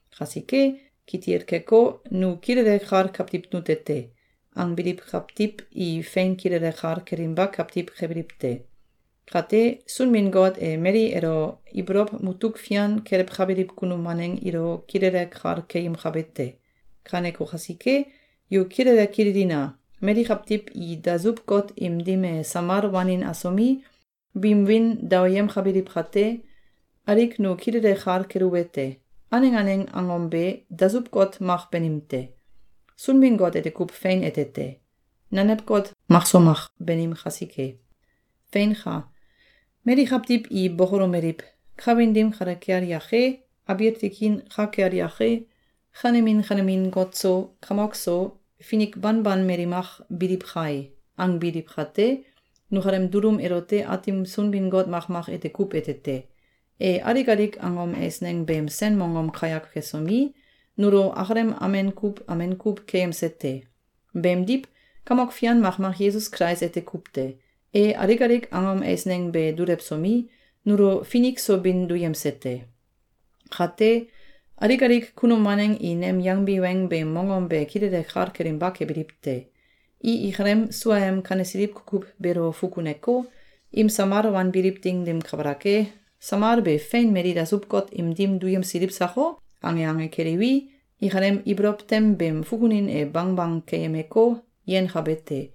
Kasike, kitil keko, “Nu kilele kal kawtiw nute te!”, angbiliw kawtiw i fein kilele kal kelinba kawtiw kebiliw te. Kate, Sunbin-Got e mali elo ibolow mutuk fian kelewkabiliw kunum waneng ilo kilele kal keyemkabe te. Kaneko kasike, yu kilele kililina! Mali kawtiw i dasuw-got im dim e samal wanin asomi, biim wiin daoyemkabiliw kate, alik nu kilele kal keluwete: Aneng aneng angom be, dasuw-got mak banim te. Sunbin-Got ete kuw fein ete te. Nanew got mak so mak banim kasike. Feinka! Mali kawtiw i bokolomeliw: “Kawin dim kale kel yake, abiil tikin ka kel yake, kanemin kanemin got so, kamok so, finik banban mali mak biliw kai!”, angbiliw kate, nukalem dulum elote Aatim Sunbin-Got makmak ete kuw ete te. E alik alik angom eisneng beem sen mongom kayak kesomi, nulo akalem amen kuw amen kuw keyemse te. Beemdiw, kamok fian makmak Yesus Kulais ete kuw te. E alik alik angom eisneng be dulewsomi, nulo finik so bin duyemse te. Kate, alik alik kunum waneng i nem yangbi weng beem mongom be kilele kal kelinba kebiliw te. I ikalem suaem kanesiliw kukuw beelo fukuneko, im samal wanbiliw ding dim kabalak e, “Samal be fein mali dasuw-got im dim duyemsiliw sako?”, ange ange keliwi, ikalem ibolow tem beem fukunin e bangbang keyemeko, yenkabe te.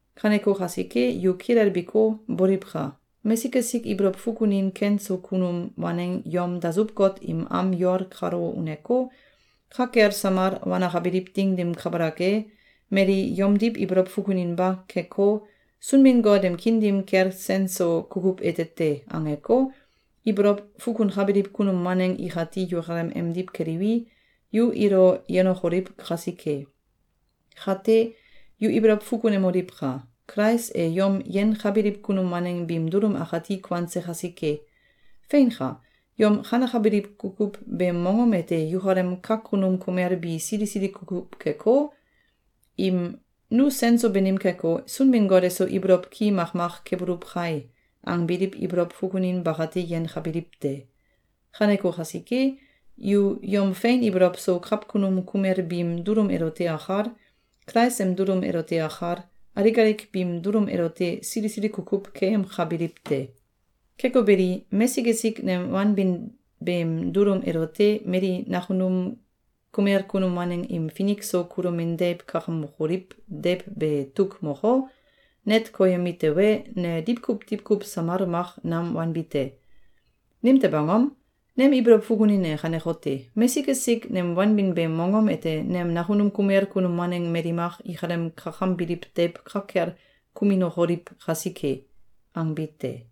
Kaneko kasike, yu kilelbiko, boliwka! Mesik esik ibolow fukunin ken so kunum waneng yom dasuw-got im am yol kalo uneko, ka kel samal wanakabiliw ding dim kabalak e, mali yomdiw ibolow fukuninba keko, “Sunbin-Got em kiin dim kel sen so kukuw ete te!”, angeko, ibolow fukunkabiliw kunum waneng ikati yukalem emdiw keliwi, yu ilo yenokoliw kasike. Kate, yu ibolow fukunemoliwka! Kulais e yom yenkabiliw kunum waneng biim dulum akati kuanse kasike. Feinka! Yom kanekabiliw kukuw beem mongom ete yukalem kakunum kumel bi sili sili kukuw keko, im “Nu sen so banim keko, Sunbin-Got eso ibolow ki makmak kebuluw kai!”, angbiliw ibolow fukunin bakate yenkabiliw te. Kaneko kasike, yu yom fein ibolow so kawkunum kumel biim dulum elote akal, Kulais em dulum elote akal, alik alik biim dulum elote sili sili kukuw keyemkabiliw te. Keko beli, mesik esik nem wanbin beem dulum elote mali nakunum kumel kunum waneng im finik so kulomin deiw kakamokoliw deiw be tuk moko, net koyemi tewe, ne diwkuw diwkuw samal mak nam wanbi te. Nimtew angom? Nem ibolow fukunin e kanekote: “Mesik esik nem wanbin beem mongom ete nem nakunum kumel kunum waneng mali mak ikalem kakambiliw deiw ka kel kuminokoliw kasike!”, angbi te.